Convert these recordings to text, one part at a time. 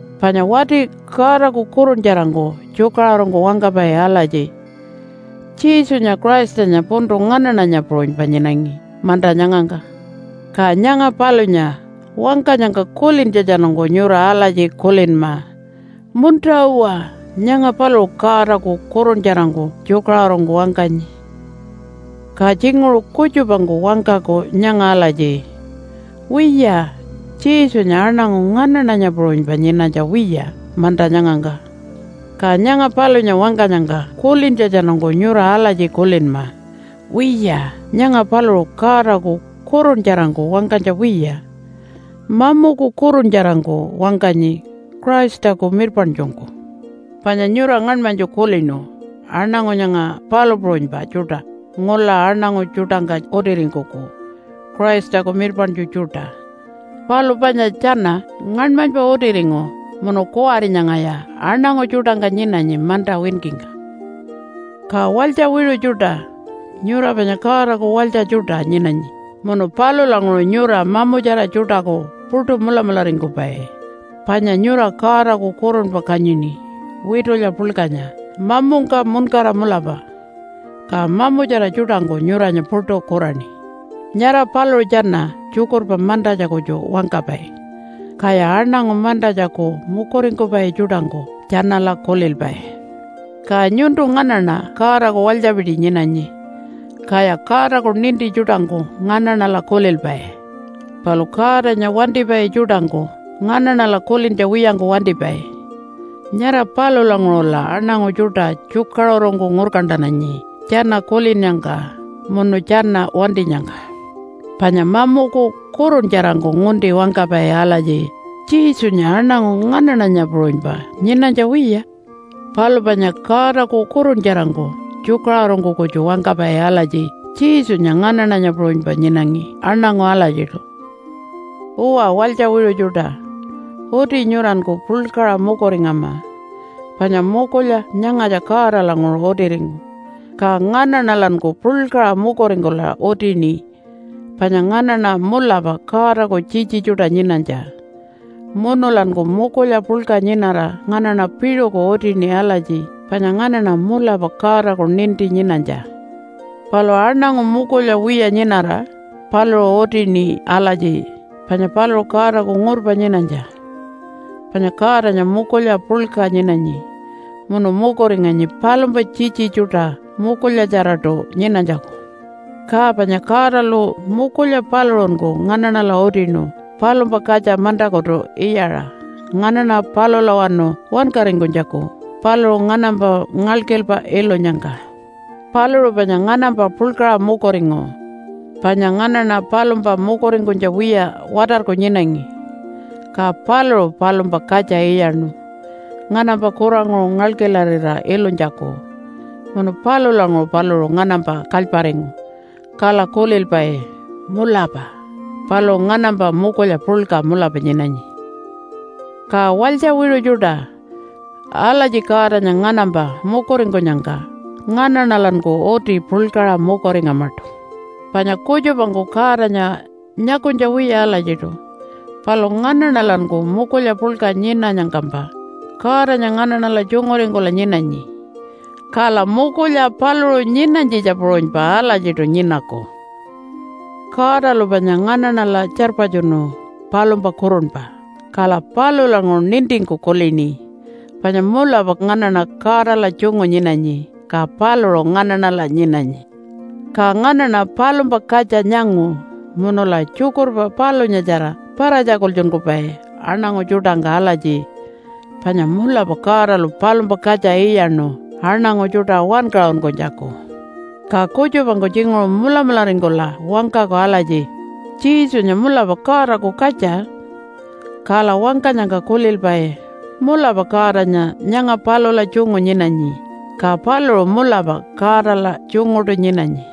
Panya wati Godaku kuruntjarangku tjukaṟurungku wangkapai alatji, “Jesunya Christanya puntu nganaṉanya puṟunypa nyinangi manta nyangangka.” Ka nyanga palunya wangkanyangka kulintjatjanungku nyura alatji kulinma, “Munta-uwa, nyanga paluṟu Godaku kuruntjarangku tjukaṟurungku wangkanyi.” Ka tjinguṟu kutjupangku wangkaku nyanga alatji, “Wiya, Jesunya aṉangu nganaṉanya puṟunypa nyinanytja wiya manta nyangangka.” Ka nyanga palunya wangkanyangka kulintjatjanungku nyura alatji kulinma, “Wiya, nyanga paluṟu Godaku kuruntjarangku wangkanytja wiya, mamuku kuruntjarangku wangkanyi Christaku mirpaṉtjungku.” Panya nyura ngaṉmanytju kulinu aṉangu nyanga palu puṟunypa tjuṯa ngula aṉangu tjuṯangka utiringkuku Christaku mirpaṉtju tjuṯa. Palu panya tjana ngaṉmanypa utiringu munu kuwari nyangaya aṉangu tjuṯangka nyinanyi manta winkingka. Ka walytja wiṟu tjuṯa, nyura panya Godaku walytja tjuṯa nyinanyi munu palulanguṟu nyura mamutjara tjuṯaku puṯu mulamularingkupai, panya nyura Godaku kurunpa kanyini witulya puḻkanya mamungka muṉkara mulapa. Ka mamutjara tjuṯangku nyuranya puṯu kuraṉi. Nyara paluṟu tjana tjukurpa mantatja kutju wangkapai, kaya aṉangu mantatjaku mukuringkupai tjuṯangku tjanala kulilpai. Ka nyuntu nganaṉa Godaku walytjapiti nyinanyi. Kaya Godaku ninti tjuṯangku nganaṉala kulilpai. Palu Godanya wantipai tjuṯangku nganaṉala kulintja wiyangku wantipai. Nyara palulanguṟula aṉangu tjuṯa tjukaṟurungku ngurkantananyi tjana kulinnyangka munu tjana wantinyangka. Panya mamuku kuruntjarangku ngunti wangkapai alatji, “Jesunya aṉangu nganaṉanya puṟunypa nyinanytja wiya.” Palu panya Godaku kuruntjarangku tjukaṟurungku kutju wangkapai alatji, “Jesunya nganaṉanya puṟunypa nyinangi aṉangu alatjiṯu.” Uwa, walytja wiṟu tjuṯa, uti nyuranku puḻkaṟa mukuringama, panya mukulya nyangatja Godalanguṟu utiringu. Ka nganaṉalanku puḻkaṟa mukuringkula utini panya nganaṉa mulapa Godaku tjitji tjuṯa nyinanytja. Munulanku mukulya puḻka nyinara nganaṉa piṟuku utini alatji panya nganaṉa mulapa Godaku ninti nyinanytja. Palu aṉangu mukulya wiya nyinara paluṟu utini alatji panya paluṟu Godaku ngurpa nyinanytja. Panya Godanya mukulya puḻka nyinanyi munu mukuringanyi palumpa tjitji tjuṯa mukulyatjaraṯu nyinanytjaku. Ka panya Godalu mukulya paluṟunku nganaṉala utinu palumpa katja mantakutu iyaṟa nganaṉa palulawanu wankaringkunytjaku paluṟu nganampa ngalkilpa ilunyangka. Paluṟu panya nganampa puḻkaṟa mukuringu. Panya nganaṉa palumpa mukuringkunytja wiya watarku nyinangi, ka paluṟu palumpa katja iyaṉu nganampa kuranguṟu ngalkilarira ilunytjaku, munu palulanguṟu paluṟu nganampa kalyparingu. Kala kulilpai, “Mulapa paluṟu nganampa mukulya puḻka mulapa nyinanyi.” Ka walytja wiṟu tjuṯa, alatji Godanya nganampa mukuringkunyangka nganaṉalanku uti puḻkaṟa mukuringamaṯu. Panya kutjupangku Godanya nyakunytja wiya alatjiṯu, palu nganaṉalanku mukulya puḻka nyinanyangkampa Godanya nganaṉala tjunguringkula nyinanyi. Kala mukulya paluṟu nyinanytjitja puṟunypa alatjiṯu nyinaku. Godalu panya nganaṉala tjarpatjunu palumpa kurunpa, kala palulanguṟu nintingku kulini panya mulapa nganaṉa Godala tjungu nyinanyi, ka paluṟu nganaṉala nyinanyi. Ka nganaṉa palumpa katja nyangu, munula tjukurpa palunyatjara para-tjakultjunkupai aṉangu tjuṯangka alatji panya mulapa Godalu palumpa katja iyaṉu aṉangu tjuṯa wankaṟunkunytjaku. Ka kutjupangku tjinguṟu mulamularingkula wangkaku alatji, “Jesunya mulapa Godaku katja.” Kala wangkanyangka kulilpai, “Mulapa Godanya nyanga palula tjungu nyinanyi, ka paluṟu mulapa Godala tjunguṯu nyinanyi.”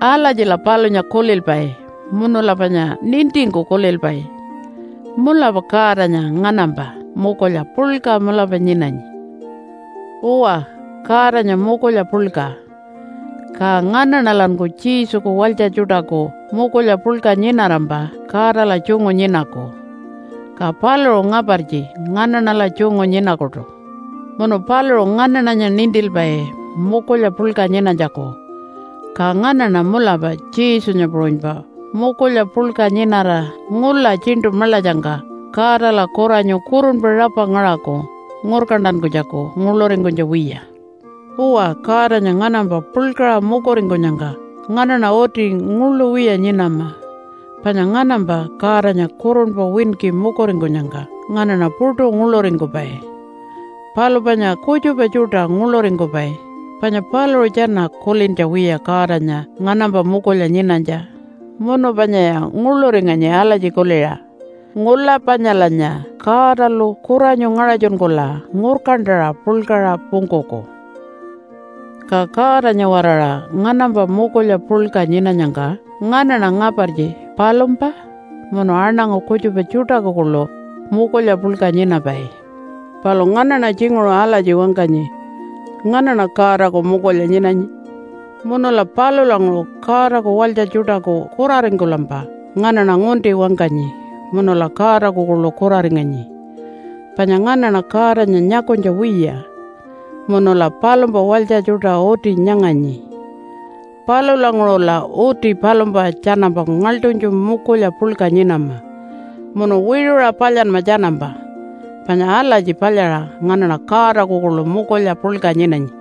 Alatjila palunya kulilpai munula panya nintingku kulilpai, “Mulapa Godanya nganampa mukulya puḻka mulapa nyinanyi.” Uwa, Godanya mukulya puḻka. Ka nganaṉalanku Jesuku walytja tjuṯaku mukulya puḻka nyinarampa Godala tjungu nyinaku, ka paluṟu ngapartji nganaṉala tjungu nyinakuṯu. Munu paluṟu nganaṉanya nintilpai mukulya puḻka nyinanytjaku. Ka nganaṉa mulapa Jesunya puṟunypa mukulya puḻka nyinara ngula Tjiṉṯu Maḻatjangka Godala kuranyu kurunpa rapa ngaṟaku ngurkantankunytjaku nguḻuringkunytja wiya. Uwa, Godanya nganampa puḻkaṟa mukuringkunyangka nganaṉa uti nguḻu wiya nyinama. Panya nganampa Godanya kurunpa winki mukuringkunyangka nganaṉa puṯu nguḻuringkupai. Palu panya kutjupa tjuṯa nguḻuringkupai, panya paluṟu tjana kulintja wiya Godanya nganampa mukulya nyinanytja munu panyaya nguḻuringanyi alatji kuliṟa, “Ngula panyalanya Godalu kuranyu ngaṟatjunkula ngurkantaṟa puḻkaṟa pungkuku.” Ka Godanya-waraṟa nganampa mukulya puḻka nyinanyangka nganaṉa ngapartji palumpa munu aṉangu kutjupa tjuṯaku kuḻu mukulya puḻka nyinapai. Palu nganaṉa tjinguṟu alatji wangkanyi, “Nganaṉa Godaku mukulya nyinanyi.” Munula palulanguṟu Godaku walytja tjuṯaku kuraringkulampa nganaṉa ngunti wangkanyi, munula Godaku kuḻu kuraringanyi. Panya nganaṉa Godanya nyakunytja wiya, munula palumpa walytja tjuṯa uti nyanganyi. Palulanguṟula uti palumpa tjanampa ngaḻṯunytju mukulya puḻka nyinama munu wiṟuṟa palyanma tjanampa, panya alatji palyaṟa nganaṉa Godaku kuḻu mukulya puḻka nyinanyi.